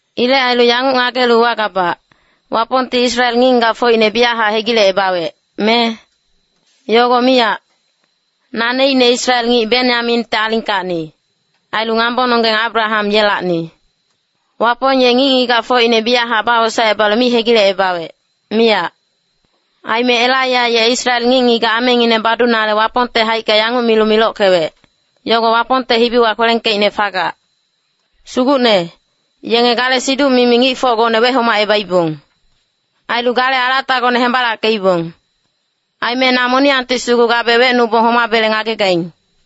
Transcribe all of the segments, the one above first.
Ilec ailu yanguc ngagelu uwagabac, Wapongti Israel ngic-ngigacfocine biyachac hegilecebawec, me? Yogo miyac! Naneicne Israel ngic Benyaminte alingkacni, ailu ngambononggeng Abraham yelacni. Wapong ye ngic-ngigacfocine biyachac bawosaecebalu mi hegilecebawec, miyac. Aime Elaiya ye Israel ngic-ngigac amengineng badunale Wapongte haicka yanguc milu milockewec, yogo Wapongte hibiwa kwelengkeicne fagac, “Sugucne, yenge gale siduc-mimi ngicfocgone wehomacebaibong. Ailu gale alatagone hembalackeibong. Aime na moniyangti sugu gabe wecnubong homabele ngagegaing.”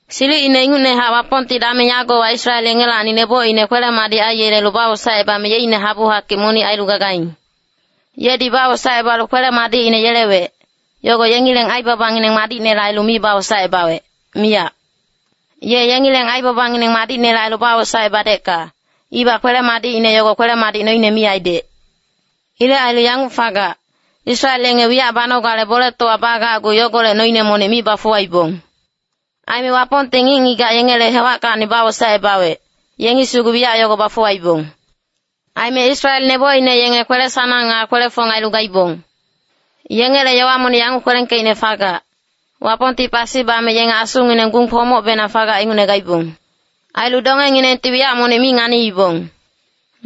Silicine ingucnehac Wapongti dameng yagowa Israel yengelacni nebocine kwele-madic aiyelelu bawosaecebame yeicne habu-hakic monic ailu gagaing. Yedi bawosaecebalu kwele-madicine yelewec, yogo yengileng aibabangineng madicnele ailu mi bawosaecebawec, miyac. Ye yengileng aibabangineng madicnele ailu bawosaecebadecka, ibac kwele-madicine yogo kwele-madic noine mi aidec. Ilec ailu yanguc fagac, Israel yenge wiyac banogale boletowa bagacgu yogolec noine monic mi bafuwaibong. Aime Wapongti ngic-ngigac yengele hewackacni bawosaecebawec, yengi sugu wiyac yogo bafuwaibong. Aime Israel nebocine yenge kwele-sanang nga kwele-fong ailu gaibong. Yengele yowa monic yanguc kwelengkeicne fagac, “Wapongti pasi bame yenge asungineng gung kwomocbenang fagac ingucne gaibong. Ailu dongenginengti wiyac monic mi nganiibong.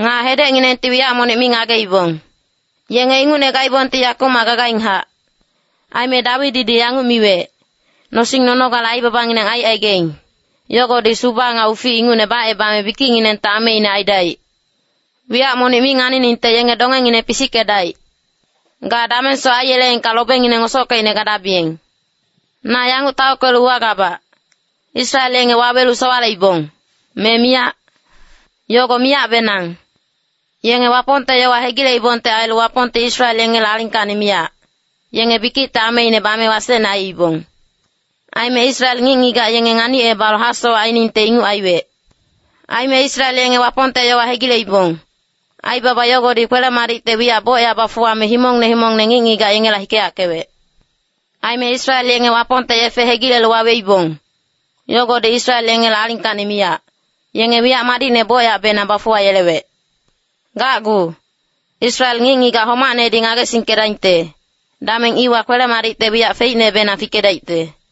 Nga hedecnginengti wiyac monic mi ngageibong. Yenge ingucne gaibongti yakumac gagainghac.” Aime Dawididi yanguc miwec, “Nosing nonogale aibabangineng aicaigaing, yogodi suba nga ufic ingucne bacebame bikicnginengte ameine aidaic. Wiyac monic mi nganiningte yenge dongengineng pisickedaic. Ga damengsoc aiyeleengka lobengineng ngosockeicne gadabiyeng.” Na yanguc taockelu uwagabac, Israel yenge wawelu sowaleibong, me miyac? Yogo miyacbenang. Yenge Wapongte yowa hegileibongte ailu Wapongti Israel yengele alingkacni miyac, yenge bikicte ameine bame wasecne aiibong. Aime Israel ngic-ngigac yenge nganicebalu hasowac ainingte inguc aiwec. Aime Israel yenge Wapongte yowa hegileibong, aibaba yogodi kwele-madicte wiyac bocyac bafuwame himongne himongne ngic-ngigac yengela hikeyackewec. Aime Israel yenge Wapongte yefe hegilelu waweibong, yogodi Israel yengele alingkacni miyac, yenge wiyac madicne bocyacbenang bafuwayelewec. Gacgu, Israel ngic-ngigac homacnedi ngagesingkedaingte, dameng iwa kwele-madicte wiyac feicnebenang fikedaicte.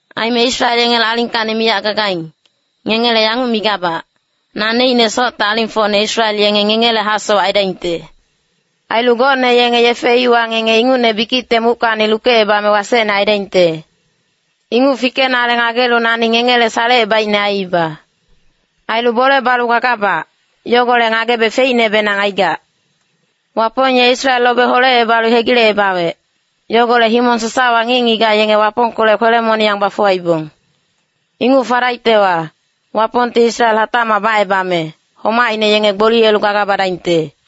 Aime Israel yengele alingkacni miyac gagaing, ngengele yanguc migabac, naneicne socte alingfocne Israel yenge ngengele hasowac aidaingte. Ailu gocne yenge yefe iwa ngenge ingucne bikicte muckacni lukecebame wasecne aidaingte. Inguc fikenale ngagelu nani ngengele salecebaicne aiiba. Ailu bole balu gagabac, yogolec ngagebe feicnebenang aigac. Wapong ye Israel lobe holecebalu hegilecebawec, yogolec himong sasawa ngic-ngigac yenge Wapongkolec kwele-moniyang bafuwaibong. Inguc fadaictewa, Wapongti Israel hatacmac bacebame, homaicne yenge gboliyelu gaga badaingte.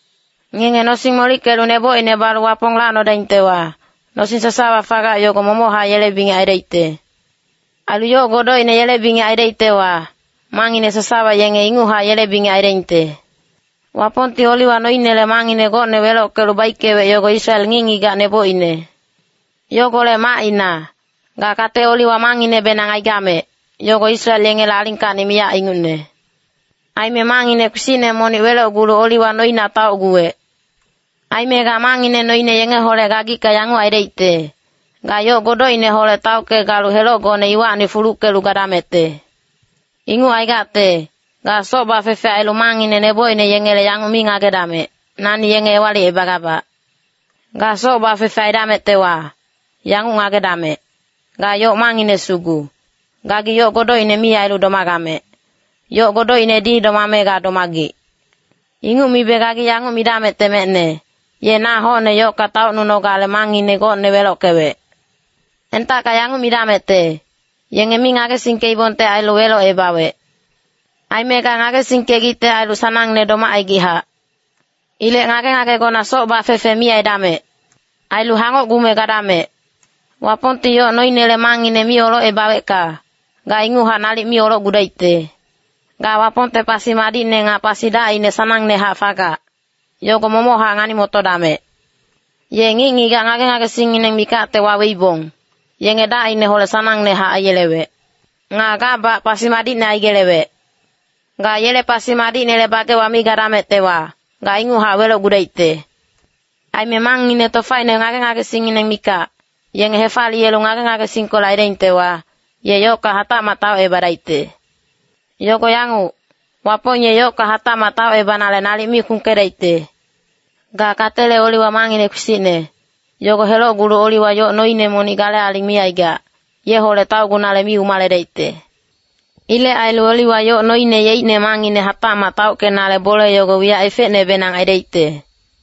Ngenge nosing molickelu nebocine balu Wapong lacnodaingtewa, nosing sasawa fagac yogo momochac yele bingec aidaicte. Ailu yoc godocine yele bingec aidaictewa, mangngine sasawa yenge inguchac yele bingec aidaingte. Wapongti oliwa noinele mangngine gocne welockelu baickewec yogo Israel ngic-ngigac nebocine. Yogolec macina, ga kate oliwa mangnginebenang aigamec, yogo Israel yengele alingkacni miyac ingucne. Aime mangngine kpisicne monic welocgulu oliwa noina taocguwec. Aime ga mangngine noine yengeholec gagicka yanguc aidaicte, ga yoc godocineholec taocke-galu helocgone iwacni fuluckelu gadamecte. Inguc aigacte, ga soc bafefe ailu mangngine nebocine yengele yanguc mi ngagedamec, “Nani yenge ewalicebagabac.” Ga soc bafefe aidamectewa, yanguc ngagedamec, ga yoc mangngine sugu, gagi yoc godocine mi ailu domagamec, yoc godocinedi domame ga domagic. Inguc mibe gagi yanguc midamecte mecne, “Ye na hocne yocka taocnunogale mangngine gocne welockewec.” Entacka yanguc midamecte, “Yenge mi ngagesingkeibongte ailu welocebawec.” Aime ga ngagesingkegicte ailu sanangne domacaigichac. Ilec ngage-ngagegona soc bafefe mi aidamec. Ailu hangocgume gadamec. Wapongti yoc noinele mangngine mi olocebawecka, ga inguchac nalic mi olocgudaicte. Ga Wapongte pasi madicne nga pasi dacine sanangnehac fagac, yogo momochac ngani-motodamec. Ye ngic-ngigac ngage-ngagesingngineng mikacte waweibong, yenge dacineholec sanangnehac aiyelewec. Nga gabac pasi madicne aigelewec. Ga yele pasi madicnele bagewa mi gadamectewa, ga inguchac welocgudaicte. Aime mangngine tofaine ngage-ngagesingngineng mikac, yenge hefaliyelu ngage-ngagesingkolec aidaingtewa, ye yocka hatacmac taocebadaicte. Yogo yanguc, Wapong ye yocka hatacmac taocebanale nalic mi kpungkedaicte. Ga katele oliwa mangngine kpisicne, yogo helocgulu oliwa yoc noine monic gale aling mi aigac, yeholec taocgunale mi umaledaicte. Ilec ailu oliwa yoc noine yeicne mangngine hatacmac taockenale bole yogo wiyac efecnebenang aidaicte.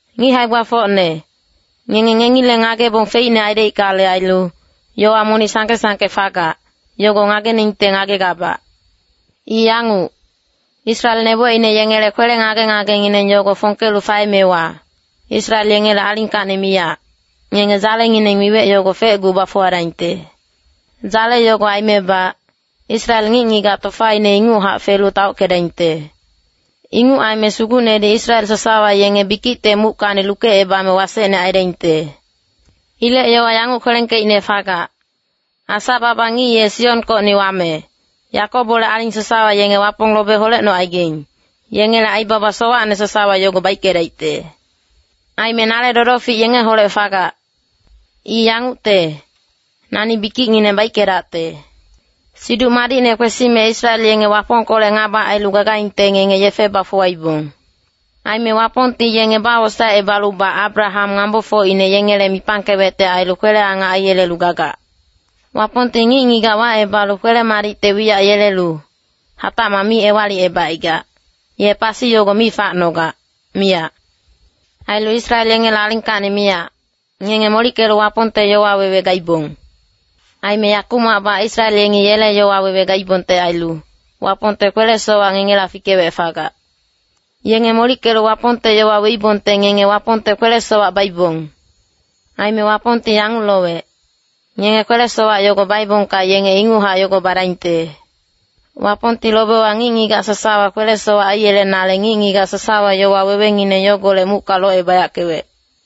Ngic hae-gbafocne, ngenge ngengileng ngagebong feicne aidaickale ailu, yowa monic sangke-sangke fagac, yogo ngageningte ngagegabac. I yanguc, Israel nebocine yengele kwele ngage-ngagengineng yogo fongkelu faemewa, Israel yengele alingkacni miyac, ngenge dzalengineng miwec yogo fecgu bafuwadaingte. Dzale yogo aimebac, Israel ngic-ngigac tofaine inguchac felu taockedaingte. Inguc aime Sugucnedi Israel sasawa yenge bikicte muckacni lukecebame wasecne aidaingte. Ilec yowa yanguc kwelengkeicne fagac, “Asa-baba ngic ye Sionkocni wame, Yakobole aling sasawa yenge Wapong lobe holecnocaigaing, yengele aibaba sowacne sasawa yogo baickedaicte.” “Aime nale dodofic yengeholec fagac. I yangucte, nani bikicngineng baickedacte.” Siduc madicne kwesime Israel yenge Wapongkolec ngaba ailu gagaingte ngenge yefe bafuwaibong. Aime Wapongti yenge bawosaecebalubac Abraham ngambofocine yengele mipangkewecte ailu kwele-angac aiyelelu gagac. Wapongti ngic-ngigac wacebalu kwele-madicte wiyac yelelu, hatacmac mi ewalicebacaigac, ye pasi yogo mi facnogac, miyac. Ailu Israel yengele alingkacni miyac, ngenge molickelu Wapongte yowa wewe gaibong. Aime yakumacbac Israel yengi yele yowa wewe gaibongte ailu, Wapongte kwele-sowac ngengela fikewec fagac. Yenge molickelu Wapongte yowa weibongte ngenge Wapongte kwele-sowac baibong. Aime Wapongti yanguc lowec, ngenge kwele-sowac yogo baebongka yenge inguchac yogo badaingte. Wapongti lobewa ngic-ngigac sasawa kwele-sowac aiyelenale ngic-ngigac sasawa yowa wewengineng yogolec mucka locebayackewec.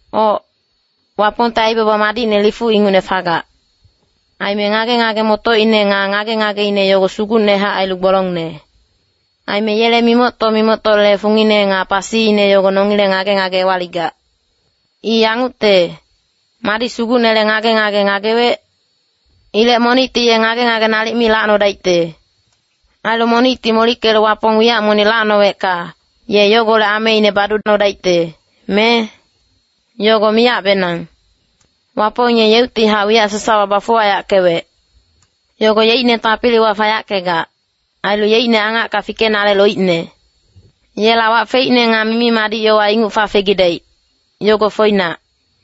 Oc, Wapongte aibaba madicne lifuc ingucne fagac. Aime ngage-ngage-motocine nga ngage-ngageine yogo sugucnehac ailu gbolongne. Aime yele mimocto-mimoctole fungine nga pasiine yogo nongileng ngage-ngage ewaligac. “I yangucte, madi Sugucnele ngage-ngage ngagewec? Ilec monicti ye ngage-ngage nalic mi lacnodaicte.” “Ailu monicti molickelu Wapong wiyac monic lacnowecka, ye yogolec ameine baducnodaicte, me? Yogo miyacbenang.” Wapong ye yeuctihac wiyac sasawa bafuwayackewec. Yogo yeicne tapiliwa fayackegac, ailu yeicne angacka fikenale loicne. Yela wac feicne nga mimi-madic yogo inguc fafegidaic, yogo foinac.